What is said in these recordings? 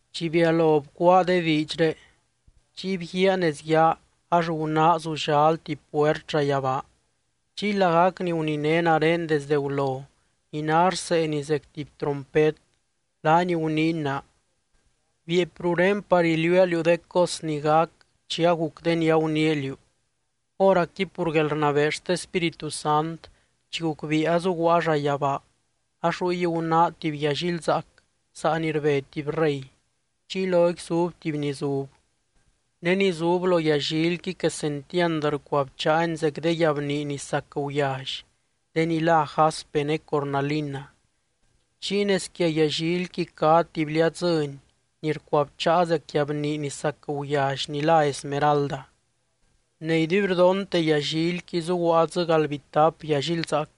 Chi bialo bcuáa de diidxré, chiy bguíaa nez yaa ax gunáa zullal tuby puert llayabaa. Chiy lagac ni guniné nare desde gulo ni ná rseeni zec tuby trompet, laany guniiny naa: —Bieepy ruré par iliuua liú de cos ni gac chi aguc de ni aguniia liú. Hóracqui pur guelrnabee xte Spíritu Sant, chi gucbiia azuguaa llayabaa ax ruy gunáa tuby yallilzaac saa ni rbe tuby rey, chiy loqui zub tuby ni zub. Ne ni zub lo yallilqui quesentiand rcuabcháany zec de guiabnii ni sac guyally, de ni lá jaspe ne cornalina. Chiy nez quia yallilqui cá tuby liadzɨ́ny ni rcuabcháa zec guiabnii ni sac guyally ni lá esmeralda. Ne iduibrdonte yallilqui gunáa dzɨ galdbitap yallilzaac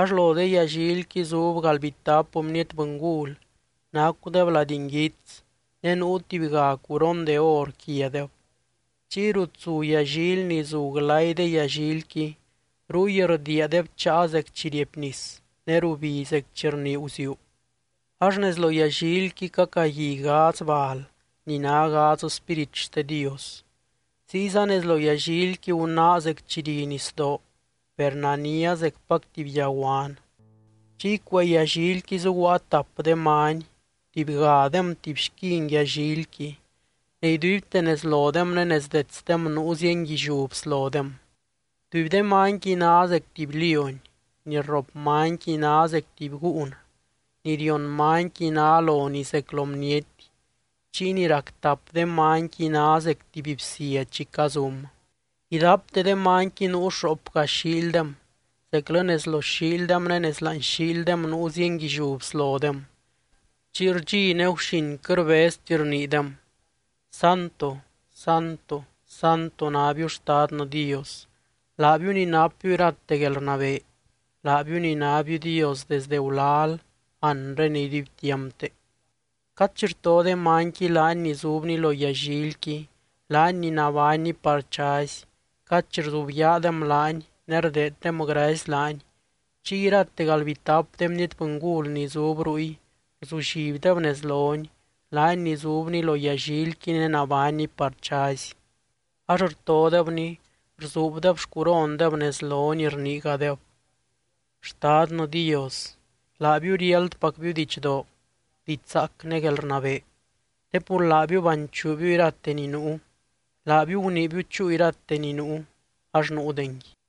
ax lo de yallilqui zub galdbitap bniety bɨngul nacudeb lady nguits ne nuu tubyga curon de or quiadeb. Chiy rut zu yallily ni zu glay de yallilqui, ruy rdiia de bcháa zec chi riepnis ne rubi zec chi rnii guziuu. Ax nez lo yallilqui cacagui gadz bal ni ná gadz spírit xte Dios. Ziyza nez lo yallilqui gunáa zec chi ri nisdoo, per nania zecpac tuby yaguan. Chiy cuee yallilqui zuguaa tap de many, tubygadem tuby xquin yallilqui ne iduibte nez lodem ne nez detsdem nuu zienguilliú bslodem. Tuby de manyqui ná zec tuby lióny, ni rrop manyqui ná zec tuby gúun, ni rion manyqui ná lonii zec lo bniety, chiy ni rac tap de manyqui ná zec tuby bsia chi cazum. Idapte de manyqui nuu xoopga xiildem, zeclɨ nez lo xiildem ne nez láani xiildem nuu zienguilliú bslodem. Chiy rdxi ne guxin quɨt rbezti rniidem: Santo, Santo, Santo nábiu Xtadnɨ Dios laabiu ni napbiu irate guelrnabee, laabiu ni nábiu Dios desde gulal, anre ne iduibtiampte. Cad chi rto de manyqui laany ni zubny lo yallilqui, laany ni nabánny par chazy, cad chi rzubyaadem laany ne rdeeddem gracy laany, chiy irate galdbitap de bniety bɨngul ni zub ruy rzullibdeb nez lony, laany ni zubny lo yallilqui ne nabánny par chazy, ax rtodebny, rzuubdeb xcurondeb nez lony, rniigadeb: Xtadnɨ Dios, laabiu riáldpacbiu didxdoo, diidx zaac ne guelrnabee. Te pur laabiu banchuubiu irate ni nuu, laabiu guniibiu chúu irate ni nuu, ax nuudengui.